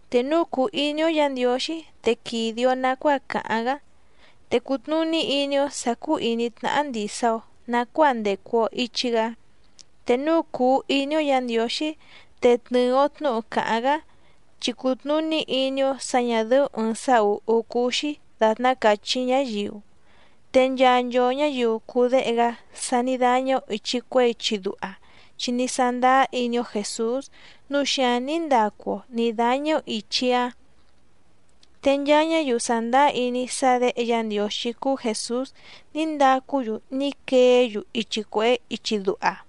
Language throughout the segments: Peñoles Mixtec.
Te núu cùu iní‑ó Yǎ Ndiǒxí te quìde‑o nacuáa càháⁿ‑gá, te cùtnuní iní‑ó sǎ cúú ìní tnáhá ndìsa‑o nacuáa ndècu‑o ichi‑gá. Te núu cùu iní‑ó Yǎ Ndiǒxí te tnɨ̀ɨ‑o tnúhu càháⁿ‑gá, chi cùtnuní iní‑ó sǎ ñà dɨ́ú ɨ̀ɨⁿ sá ùhú cúú‑xí dàtná càchí ñáyiu. Te nchaa nchoo ñǎyiu cùu déhe‑gá sa ní dáñá‑ó ìchi cuehé ichi duha, chi ní sándáá iní‑ó Jèsús nǔu xíǎⁿ ní ndacu‑o nǐ dáñá‑ó ìchi‑áⁿ. Te nchaa ñáyiu sàndáá iní sá Děhe Yá Ndiǒxí cúú Jèsús ní ndacú‑yu ní queé‑yu ichi cuèhé ichi duha.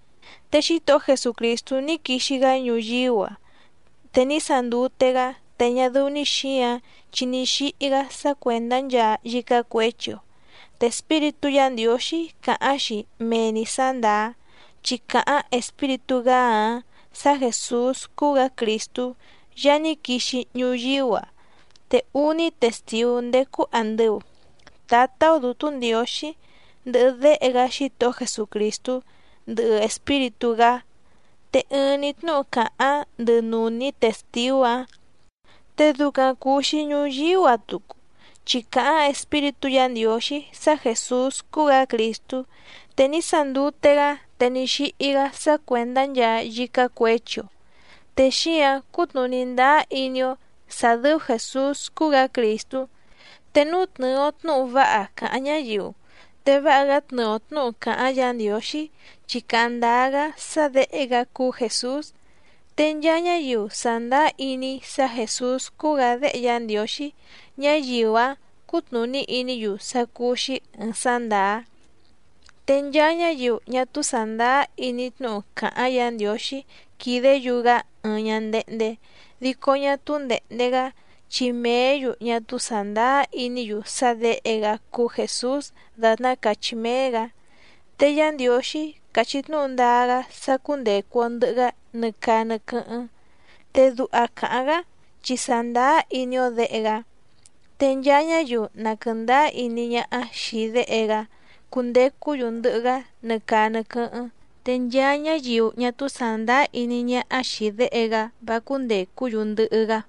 Te Xítohó Jesucrìstú ní quixi‑gá ñuyíú‑a, te ní sandute‑gá. Te ñá dɨ́ú‑ní xǐǎⁿ, chi ní xíhí‑gá sá cuèndá nchaa yícá cuěchi‑o. Te Espíritú Yǎ Ndiǒxí càháⁿ‑xi mee‑ni sǎ ndàá, chi càháⁿ Espíritú‑gá‑áⁿ sǎ Jèsús cúú‑gǎ Crìstú Yaá ní quixi ñuyíú‑a. Te úní testìú ndécú àndɨu, Tǎtá‑ó Dǔtú Ndiǒxí, ndɨhɨ Déhe‑gá Xítohó Jesucrìstú, ndɨhɨ Espíritú‑gá. Te ɨɨⁿ‑ni tnúhu càháⁿ ndɨ nùní testìú‑áⁿ. Te ducaⁿ cùu‑xi ñuyíú‑a tucu, chi càháⁿ Espíritú Yǎ Ndiǒxí sá Jèsús cúú‑gǎ Crìstú. Te ní sandute‑gá, te ní xíhí‑gá sá cuèndá nchaa yícá cuěchi‑o. Te xíǎⁿ cútnùní ndáá iní‑ó sǎ dɨ́ú Jèsús cúú‑gǎ Crìstú. Te núu tnɨ̀ɨ‑o tnúhu váha càháⁿ ñáyiu, te váha‑gá tnɨɨ‑o tnǔhu càháⁿ Yǎ Ndiǒxí, chi càháⁿ ndáá‑gá sá Děhe‑gá cúú Jèsús. Te nchaa ñáyiu sàndáá iní sá Jèsús cúú‑gǎ Déhe Yá Ndiǒxí, ñáyiu‑áⁿ cútnùní iní‑yu sá cúú‑xí ɨ̀ɨⁿ sá ndàá. Te nchaa ñáyiu ñá túú sàndáá iní tnúhu càháⁿ Yǎ Ndiǒxí quìdé‑yu‑gá ɨɨⁿ ñándéhndé, dico ñá túú ndèhnde‑gá, chi mèé‑yu ñá túú sàndáá iní‑yu sá Děhe‑gá cúú Jèsús dàtná càchí méé‑gǎ. Te Yá Ndiǒxí càchí tnúhu ndáá‑gá sá cúndècu‑o ndɨhɨ‑gá nɨ caa nɨ quɨ́hɨ́ⁿ. Te duha càháⁿ‑gá chi sàndáá iní‑ó Děhe‑gá. Te nchaa ñáyiu na quɨ̀ndáá iní ñáhá xìi Déhe‑gá cundecú‑yu ndɨhɨ‑gá nɨ caa nɨ quɨ́hɨ́ⁿ. Te nchaa ñáyiu ñá túú sàndáá iní ñáhá xìi Déhe‑gá vá cúndècú‑yu ndɨhɨ́‑gá.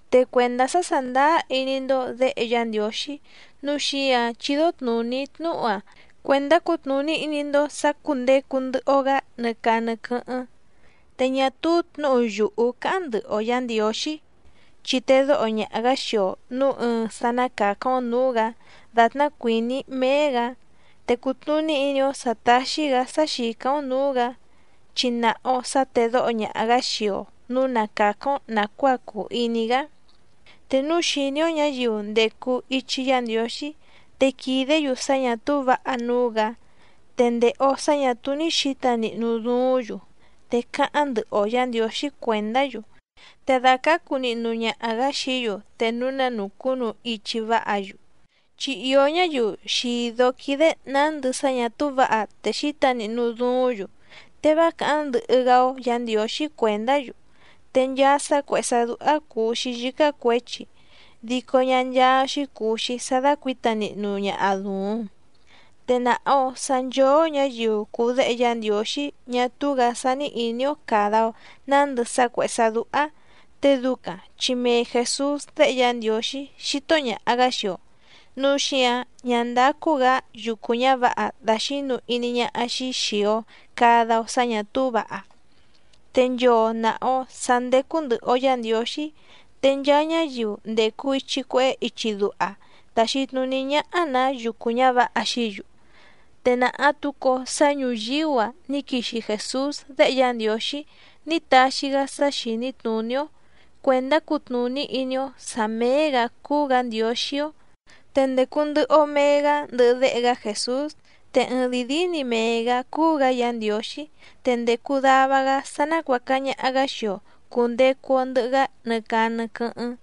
Te cuèndá sá sàndáá iní‑ndó Děhe Yá Ndiǒxí nǔu xíǎⁿ chídó tnùní‑í tnúhu‑a cuèndá cutnùní iní‑ndó sǎ cúndècu ndɨhɨ‑o‑gá nɨ caa nɨ quɨ́hɨ́ⁿ. Te ñá túú tnǔhu yùhú cáháⁿ ndɨhɨ‑o Yǎ Ndiǒxí, chi tedóho ñaha‑gǎ xii‑o nǔu ɨɨⁿ‑ná sá ná càcáⁿ‑ó nǔú‑gǎ dàtná cuìní méé‑gǎ. Te cùtnuní iní‑ó sǎ táxí‑gǎ sá xìcáⁿ‑ó nǔú‑gǎ, chi nàha‑o sá tèdóho ñaha‑gǎ xii‑o nǔu na càcáⁿ‑ó nàcuáa cùu iní‑gá. Te núu xìní‑ó ñǎyiu ndècu ichi Yá Ndiǒxí te quìdé‑yu sá ñà túú vǎha núú‑gǎ, te ndèhe‑o sá ñà túú ní xǐta nihnu duúⁿ‑yu, te cáháⁿ ndɨhɨ‑o Yǎ Ndiǒxí cuèndá‑yu, te dàcácu nihnu ñaha‑gǎ xií‑yu te núu na nùcúnu ichi váha‑yu. Chi ìó ñáyiu xìdó quídé nǎndɨ sá ñà túú vǎha te xíta nihnu duúⁿ‑yu, te vá càháⁿ ndɨhɨ‑gá‑ó Yǎ Ndiǒxí cuèndá‑yu. Te nchaa sá cuèhé sá dúhá cùu‑xi yícá cuěchi, dico ñá ncháá‑xí cùu‑xi sá dácuǐta nihnu ñaha dùuⁿ. Te nàha‑o sá nchóó ñǎyiu cùu déhe Yá Ndiǒxí ñá túú‑gǎ sání ìní‑ó càda‑o nándɨ sá cuèhé sá dúhá. Te ducaⁿ chi mee Jèsús déhe Yá Ndiǒxí xító ñàha‑gá xii‑o, núu xíǎⁿ ñá ndácú‑gǎ yucu ñǎvǎha dàxínu iní ñáhá‑xí xìi‑o cada‑o sá ñà túú vǎha. Te nchoo nàha‑o sá ndécú ndɨ̀hɨ‑o Yá Ndiǒxí. Te nchaa ñáyiu ndècu ichi cuehé ichi duha tàxi tnuní ñáhá‑nǎ yucu ñǎvǎha xií‑yu. Te nàha tucu‑o sá ñùyíú‑a ní quixi Jèsús Déhe Yá Ndiǒxí ní taxi‑gá sá xìní tnùní‑ó cuèndá cutnùní iní‑ó sǎ méé‑gǎ cúú‑gǎ Ndiǒxí‑ó. Te ndècu ndɨhɨ‑o mee‑gá ndɨhɨ Déhe‑gá Jèsús, te ɨɨⁿdìi díí‑ni mee‑gǎ cúú‑gǎ Yǎ Ndiǒxí, te ndècu dava‑gá sá nácuàca ñaha‑gá xii‑o cùndecu‑o ndɨhɨ‑gá nɨ caa nɨ quɨ́hɨ́ⁿ.